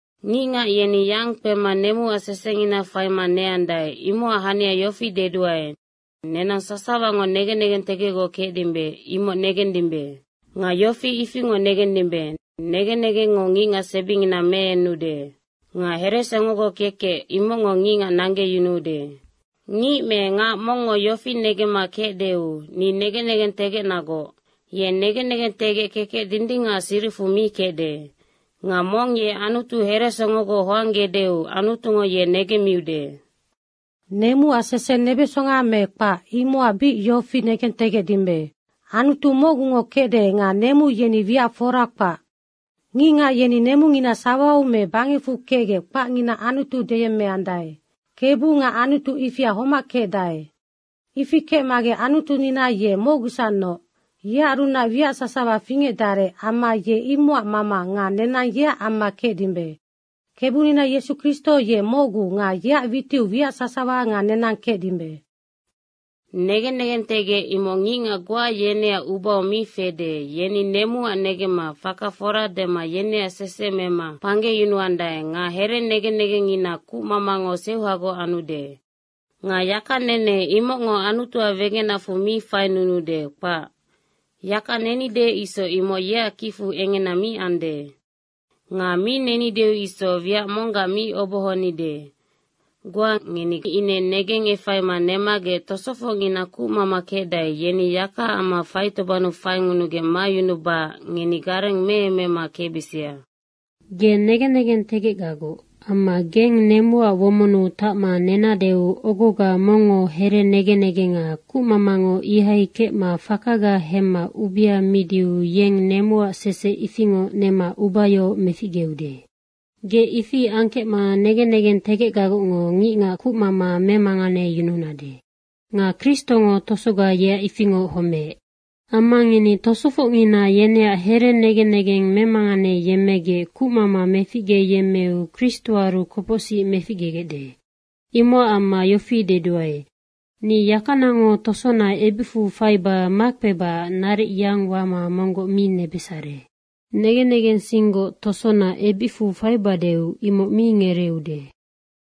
Ngicngac yeni yang kpema nemuac sesengina faima neandae, imocac hania yofi deduae, nenang sasawango negen negentegecgoc kecdimbe, imoc negendimbe. Nga yofi ifingoc negendimbe, “Negen negengngo ngicngac sebingina meenude.” Nga heresongogoc kekec imocngo ngicngac nanggeyunuude. Ngic me ngac mongngo yofi negemma kecdeu, “Ni negen negentegecnagoc.” ye negen negentegec kekec dindingacac siricfu mi kecde. Nga mong ye Anutu heresongogoc hoanggedeu Anutungo ye negemmiude. Nemuac sese nebesonga me kpac, imocac yofi bic negentegecdimbe. Anutu mocgungo kecde nga nemu yeni wiac fora kpac. Ngicngac yeni nemungina sawau me bangecfu kecgec kpacngina anutu deyemmeandae. Kebu nga anutu ifia homac kecdae. Ifi kecmagec Anutunina ye mocgusacnoc. Yearunac wiac sasawa fingecdarec amma ye imocac mama nga nenang yeac amma kecdimbe. Kebunina Yesu Kristo ye mocgu nga yeac witiu wiac sasawa nga nenang kecdimbe. Negen negentegec imoc ngicngac goa yeneac ubau mi fede, yeni nemuac negemma faka fora dema yeneac sese nema kpanggeyunuandae nga here negen negengngina kucmamango seuhagoc anude. Nga yakanene imocngo Anutuac wegenacfu mi fainunuude, kpac. Yaka nenide isoc imoc yeac kicfu engena mi ande. Nga mi nenideu isoc wiac monggac mi obohonide. Goa ngeni ine negengefaima nemagec tosofocngina kucmama kecdae, yeni yakaac amma faitobannu faiyunugec mayunubacac ngeni gareng meemema kecbisia. Ge negen negentegecgagoc. Amma geng nemuac womonnu tacma nenadeu ogoga mongngo here negen negenga kucmamango ihai kecma fakaga hemma ubea midiu yeng nemuac sese ifingoc nema ubayohoc meficgeude. Ge ifi angkecma negen negentegecgagocngo ngicngac kucmama memanganeyununade. Nga Kristongo tosoga yeac ifingoc homeec. Amma ngeni tosofocngina yeneac here negen negeng memanganeyemmegec kucmama fingecyemmeu Kristoaru kopocsic meficgegecde. Imocac amma yofi deduae, ni yakanango tosona ebicfu faiba makpebacac naric yang wama monggoc mi nebesare. Negen negensinggoc tosona ebicfu faibadeu, imoc mi ngereeude.